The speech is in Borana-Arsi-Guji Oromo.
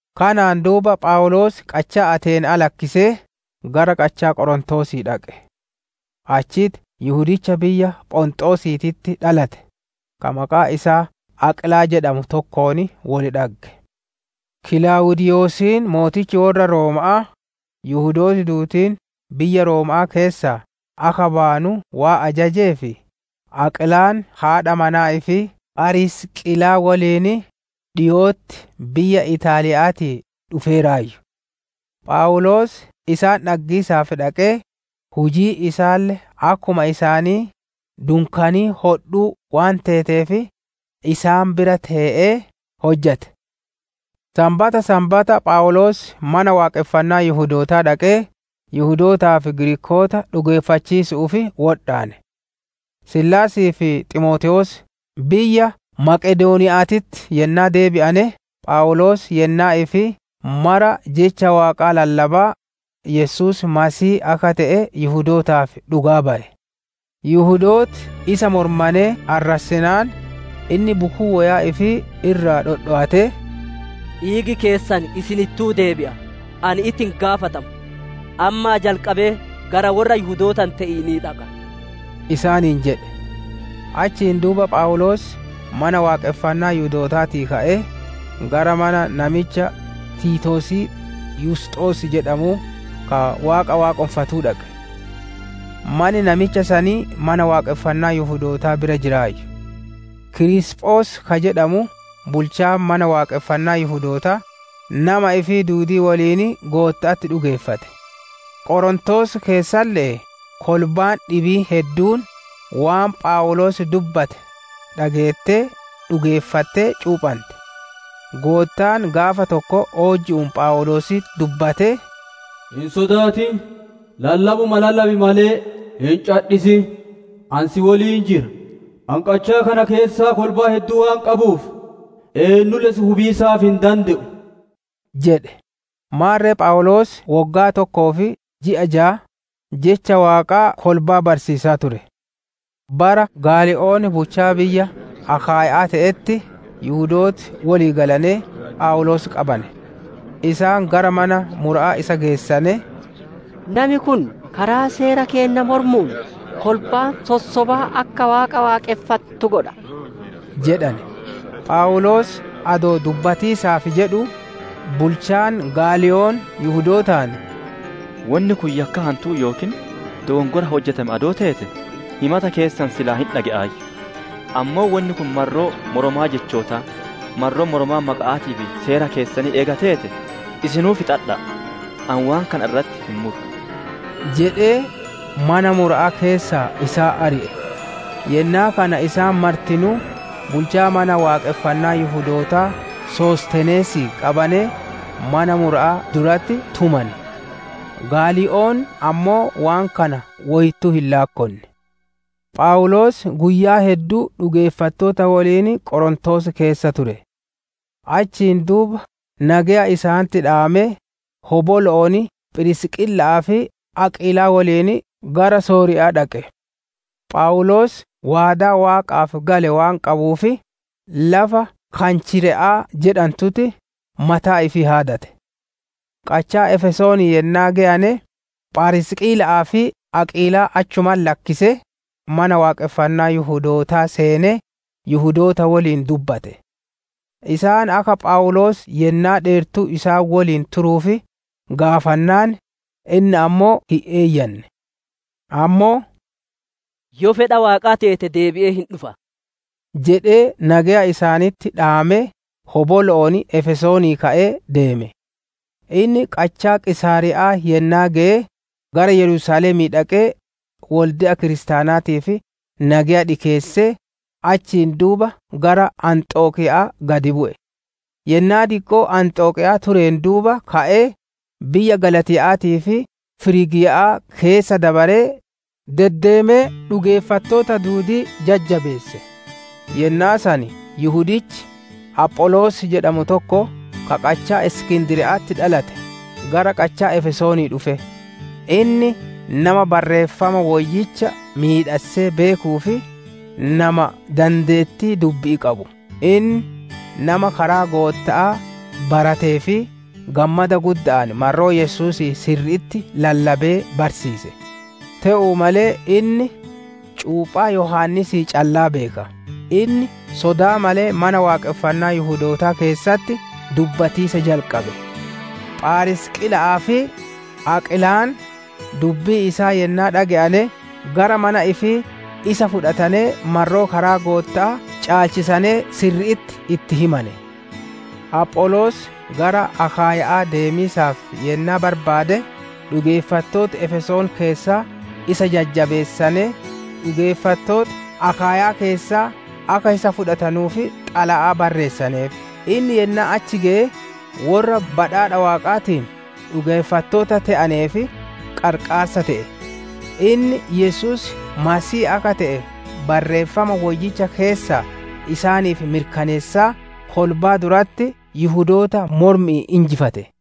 Kanaan duuba Phawuloos qachaa Ateena'aa lakkisee, gara qachaa Qorontoosii dhaqe. Achitti Yihudicha biyya Phonxoosiititti dhalate, ka maqaan isaa Aqiilaa jedhamu tokkoon wol dhagge. Kilaawudiiyosiin mootichi worra Rooma'aa, Yihudooti duudiin biyya Rooma'aa keessaa akka bayanu waan ajajeef, Aqiilaan haadha manaa ifii Pharisiqiilaa woliin dhiko'otti biyya Ixaaliya'aatii dhufeeraayyu. Phawuloos isaan dhaggiisaaf dhaqee, hujiin isaalle akkuma isaanii dunkaanii hodhuu waan teeteef, isaan bira tee'ee hojjate. Sanbata Sanbata Phawuloos Mana Waaqonfannaa Yihudootaa dhaqee, Yihudootaa fi Giriikoota dhugeeffachiisu'uuf wodhaane. Siilaasii fi Ximootewoos biyya Maqedooniya'aatii yennaa deebi'ane, Phawuloos yennaa ifii mara jecha Waaqaa lallabaa, Yesuus Masiihii akka te'e Yihudootaaf dhugaa baye. Yihudooti isa mormanee arrassiinaan, inni bukuu woyaa ifii irraa dhodhowatee, «Dhiigi keessan isinittuu deebi'a; ani itti hin gaafatamu. Ammaa jalqabee gara worra Yihudoota hin te'inii dhaqa» isaaniin jedhe. Achiin duuba Phawuloos Mana Waaqonfannaa Yihudootaatii ka'ee, gara mana namicha Tiitoosii Yusxos jedhamu, ka Waaqa waaqonfatuu dhaqe; manni namicha sanii mana Waaqonfannaa Yihudootaa bira jiraayyu. Kiriisphos ka jedhamu bulchaan mana waaqonfannaa Yihudootaa, nama ifii duudii woliin Gootta'atti dhugeeffate; Qorontoos keessalle'ee kolbaan dhibiin hedduun, waan Phawuloos dubbate dhageettee dhugeeffattee, cuuphante. Goottaan gaafa tokko oojju'uun Phawuloositti dubbatee, «Hin sodaatin; lallabuma lallabi malee, hin cadhisin. Ani si woliin jira; ani qachaa kana keessaa kolbaa hedduu waan qabuuf, eennulle si hubiisaaf hin dande'u» jedhe. Maarre Phawuloos woggaa tokkoo fi ji'a jaa, Jecha Waaqaa kolbaa barsiisaa ture. Bara Gaalii'oon bulcha biyya Akaayya'aa te'etti Yihudooti wolii galanee, Phawuloos qabane; isaan gara mana mura'aa isa geessanee, «Nami kun karaa seera keenna mormuun, kolbaa sossobaa akka Waaqa Waaqonfattu godha» jedhane. Phawuloos adoo dubbatiisaaf jedhuu, bulchaan Gaalii'oon Yihudootaan, «Wonni kun yakkaa hantuu yookiin dokonkora hojjatame adoo teete, himata keessan silaa hin dhage'aayyu. Ammoo wonni kun marroo moromaa jechootaa, marroo moromaa maqa'aatii fi seera keessanii eega teete, isinuu fixadha'a. Ani waan kana irratti hin muru» jedhee, mana mura'aa keessaa isaan ari'e. Yennaa kana isaan martinuu, bulchaa Mana Waaqonfannaa Yihudootaa Sostenees qabanee, mana mura'aa duratti tumane. Gaalii'oon ammoo waan kana woyittuu hin laakkonne. Phawuloos guyyaa hedduu dhugeeffattoota woliin Qorontoos keessa ture; achiin duuba nageya isaanitti dhaamee, hobolo'oon Phirisqiila'aa fi Aqiilaa woliin gara Sooriya'aa dhaqe; Phawuloos waadaa Waaqaaf gale waan qabuuf, lafa Kanchire'aa jedhantutti mataa ifii haadate. Qachaa Efesoonii yennaa geyane, Pharisiqiila'aa fi Aqiilaa achumatti lakkisee, Mana Waaqonfannaa Yihudootaa seenee Yihudoota woliin dubbate. Isaan akka Phawuloos yennaa dheertuu isaan woliin turuuf gaafannaan, inni ammoo hin eeyyanne. Ammoo «Yoo fedha Waaqaa teete deebi'ee hin dhufa» jedhee, nageya isaanitti dhaamee hobolo'oon Efesoonii ka'ee deeme. Inni qachaa Qiisaariya'aa yennaa geye, gara Yerusaalemii dhaqee wolde'a kiristaanaatiif nageya dhikeessee, achiin duuba gara Anxokiya'aa gad bu'e. Yennaa diqqoo Anxokiyaa tureen duuba ka'ee, biyya Galaatiya'aatii fi Firiigiya'aa keessa dabaree, deddeemee dhugeeffattoota duudii jajjabeesse. Yennaa san Yihudichi Apholoos jedhamu tokko, ka qachaa Iskindriya'atti dhalate gara qachaa Efesoonii dhufe. Inni nama Barreeffama Woyyicha miidhassee beekuu fi nama dandeettii dubbi'ii qabu. Inni nama karaa Gootta'aa baratee fi gammada gudda'aan marroo Yesuusii sirri'itti lallabee barsiise. Te'uu malee inni cuuphaa Yohaannisii callaa beeka. Inni sodaa malee Mana Waaqonfannaa Yihudootaa keessatti dubbatiisa jalqabe. Pharisiqiila'aa fi Aqiilaan dubbii isaa yennaa dhage'ane, gara mana ifii isa fudhatanee marroo karaa Gootta'aa caalchisane sirri'itti itti himane. Apholoos gara Akaayya'aa deemiisaaf yennaa barbaade, dhugeeffattooti Efesoon keessaa isa jajjabeessanee, dhugeeffattooti Akaayyaa keessaa akka isa fudhatanuuf xalayaa barreessaneef. Inni yennaa achi geye, worra badhaadha Waaqaatiin dhugeeffattoota te'aneef qarqaarsa te'e. Inni Yesuus Masiihii akka te'e Barreeffama Woyyicha keessaa isaaniif mirkaneessaa, kolbaa duratti Yihudoota mormi'iin injifate.